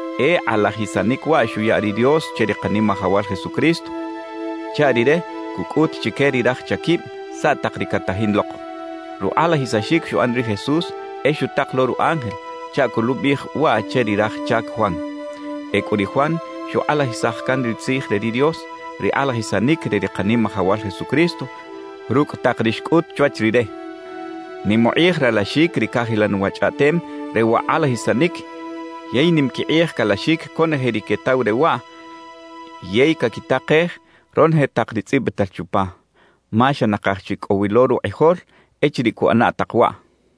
E kꞌalajisanic waꞌ xuya ri Dios che ri Kanimajawal Jesucristo chaꞌ Rire cucꞌut chique ri raj chaquib saꞌ tak ri catajin lok. Rukꞌalajisaxic xuꞌan ri Jesús e xutak lo ru ángel chaꞌ coluꞌbiꞌij waꞌ che ri raj chac Juan. Ecꞌu ri Juan xukꞌalajisaj can ri tzij re ri Dios, ri kꞌalajisanic re ri Kanimajawal Jesucristo rucꞌ tak ri xcꞌut chwach rire. Nim ukꞌij ralaxic ri cajilan wa chꞌaꞌtem re wa kꞌalajisanic yey nim quikꞌij calaxic conoje ri quetaw re waꞌ yey caquitakej ronoje tak ri tzꞌibital chupa, ma xa nakaj chi cꞌo wi lo rukꞌijol echiriꞌ cuꞌana tak waꞌ.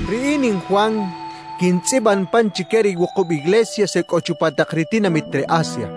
Riꞌin in Juan quintzꞌiban pan chique ri wukub iglesias e cꞌo chupa tak ri tinamit re Asia.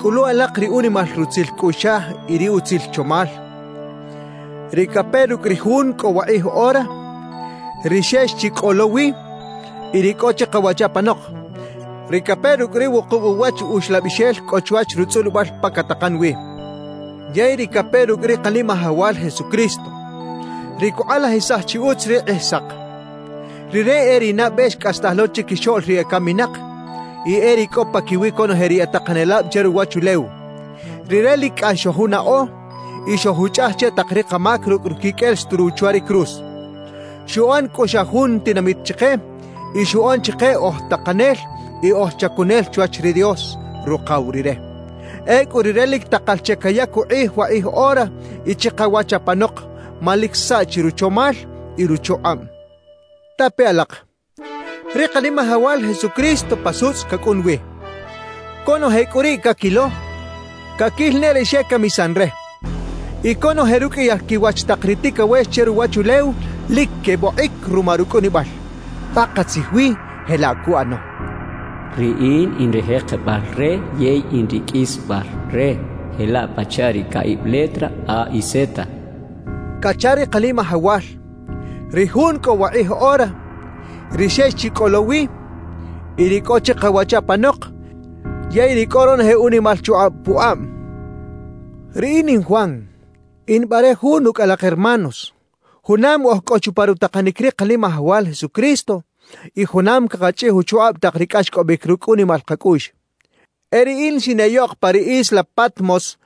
Cꞌulu alak ri unimal rutzil cꞌuꞌxaj y ri utzil chomal, ri cape rucꞌ ri Jun cꞌo wakꞌij ora, ri xex chi cꞌo lo wi y ri cꞌo chikawach apanok, ri cape rucꞌ ri wukub uwach Uxlabixel cꞌo chwach rutzꞌulibal pa catakan wi, yey ri cape rucꞌ ri Kanimajawal Jesucristo, ri cukꞌalajisaj chi utz ri Kꞌijsak. Rire e ri nabe xcꞌastaj lo chiquixoꞌl ri ecaminak y e ri cꞌo paquiwi conoje ri e takanelab che ruwachulew. Rire lic cꞌax xojunaꞌo y xojuchꞌaj che tak ri kamac rucꞌ ruquiqꞌuel xturuw chwa ri cruz. Xuꞌan cꞌu xa jun tinamit chike y xuꞌan chike oj takanel y oj chacunel chwach ri Dios, Rukaw Rire. Ecꞌu Rire lic takal che cayac ukꞌij wakꞌij ora y chikawach apanok ma lic saꞌchi ruchomal y ruchukꞌab. Tape alak, ri Kanimajawal Jesucristo pa sutzꞌ cacꞌun wi. Conoje cꞌu riꞌ caquilo, caquil ne ri xecamisan re. Y conoje ruqꞌuiyal quiwach tak ri ticawex che ruwachulew lic quebokꞌic ruma rucꞌunibal. Pakatzij wi jelaꞌ cuꞌano. «Riꞌin in ri jekebal re yey in ri qꞌuisbal re, jelaꞌ pachaꞌ ri caꞌib letra A y Z» cacha ri Kanimajawal, ri Jun cꞌo wakꞌij ora, ri xex chi cꞌo lo wi y ri cꞌo chikawach apanok yey ri cꞌo ronoje unimal chukꞌab pukꞌab. Riꞌin in Juan in bare jun ucꞌ alak hermanos, junam oj cꞌo chupa rutakanic ri Kanimajawal Jesucristo y junam cakachꞌij uchukꞌab tak ri cꞌaxcꞌobic rucꞌ unimal kacꞌuꞌx. E riꞌin xineꞌyoꞌk pa ri isla Patmos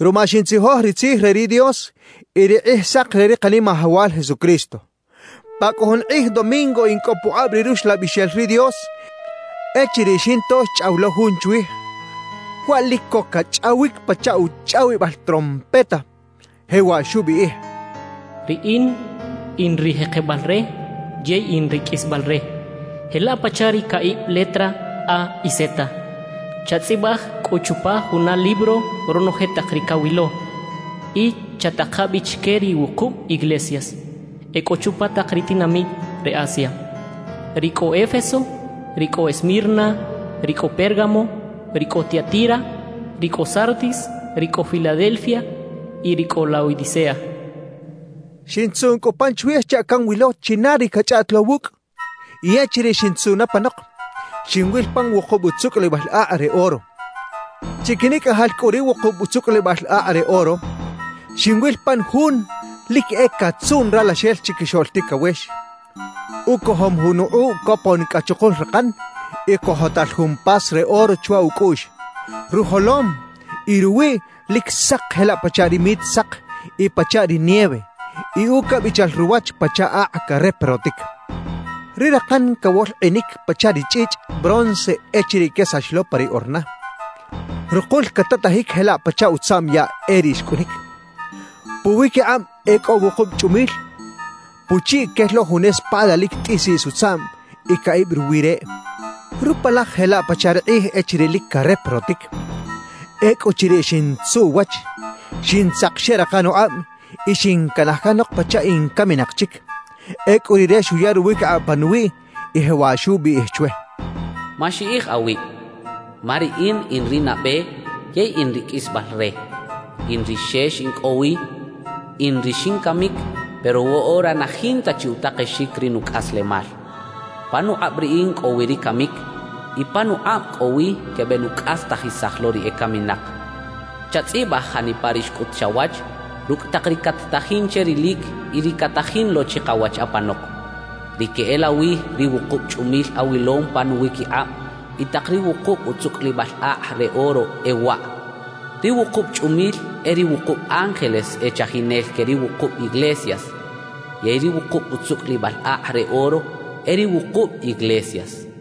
ruma xintzijoj ri Tzij re ri Dios y ri Kꞌijsak re ri Kanimajawal Jesucristo. Pa cꞌu jun kꞌij domingo in cꞌo pukꞌab ri Ruxlabixel ri Dios echiriꞌ xinto xchꞌaw lo Jun chwij, waꞌ lic co cachꞌawic pachaꞌ uchꞌawibal trompeta. Jewaꞌ xubiꞌij: «Riꞌin in ri jekebal re yey in ri qꞌuisbal re, jelaꞌ pachaꞌ ri caꞌib letra A y Z. Chatzꞌibaj cꞌu chupa juna libro ronoje tak ri cawilo y chataka bi chique ri wukub iglesias e cꞌo chupa tak ri tinamit re Asia: ri cꞌo Éfeso, ri cꞌo Esmirna, ri cꞌo Pérgamo, ri cꞌo Tiatira, ri cꞌo Sardis, ri cꞌo Filadelfia y ri cꞌo Laodicea» xchaꞌ. Xintzuꞌn cꞌu pan chwij chaꞌ canwilo china ri cachꞌaꞌt lo wucꞌ; y echiriꞌ xintzuꞌn apanok, xinwil pan wukub utzucꞌulibal akꞌ re oro. Chiquinicꞌajal cꞌu ri wukub utzucꞌulibal akꞌ re oro, xinwil pan Jun lic e catzuꞌn Ralaxel Chiquixoꞌl Ticawex. Ucojom jun ukꞌuꞌ copon cꞌa chukul rakan y cojotal jun pas re oro chwa ucꞌuꞌx. Rujolom y ruwiꞌ lic sak jelaꞌ pachaꞌ ri mit sak y pachaꞌ ri nieve; y ucabichal ruwach pachaꞌ akꞌ careprotic. Ri rakan cawolkꞌinic pachaꞌ ri chꞌichꞌ bronce echiriꞌ quesax lo pa ri orna; rukul catatajic jelaꞌ pachaꞌ utzaꞌm yaꞌ e riꞌ xcꞌunic. Puwiquikꞌab e cꞌo wukub chꞌumil; puchiꞌ quel lo jun espada lic tꞌisiꞌs utzaꞌm y caꞌib ruwi reꞌ. Rupalaj jelaꞌ pachaꞌ ri kꞌij echiriꞌ lic careprotic. Ecꞌuchiriꞌ xintzuꞌ uwach, xintzak xeꞌrakan ukꞌab y xincanaj canok pachaꞌ in caminak chic. Ecꞌu Rire xuya ruwiquikꞌab panuwiꞌ y jewaꞌ xubiꞌij chwe: «Maxiꞌij awib, ma Riꞌin in ri nabe yey in ri qꞌuisbal re. In ri xex in cꞌo wi, In ri xincamic, pero woꞌora na jinta chi utakexic ri nucꞌaslemal. Panukꞌab Riꞌin cꞌo wi ri camic y panukꞌab cꞌo wi quebenucꞌastajisaj lo ri ecaminak. »Chatzꞌibaj janipa ri xcꞌut chawach, rucꞌ tak ri cat-tajin che rilic y ri catajin lo chikawach apanok. Ri queꞌelawi ri wukub chꞌumil awilom pa nuwiquikꞌab y tak ri wukub utzucꞌulibal akꞌ re oro e waꞌ: Ri wukub chꞌumil e ri wukub ángeles e chajinel que ri wukub iglesias; yey ri wukub utzucꞌulibal akꞌ re oro e ri wukub iglesias.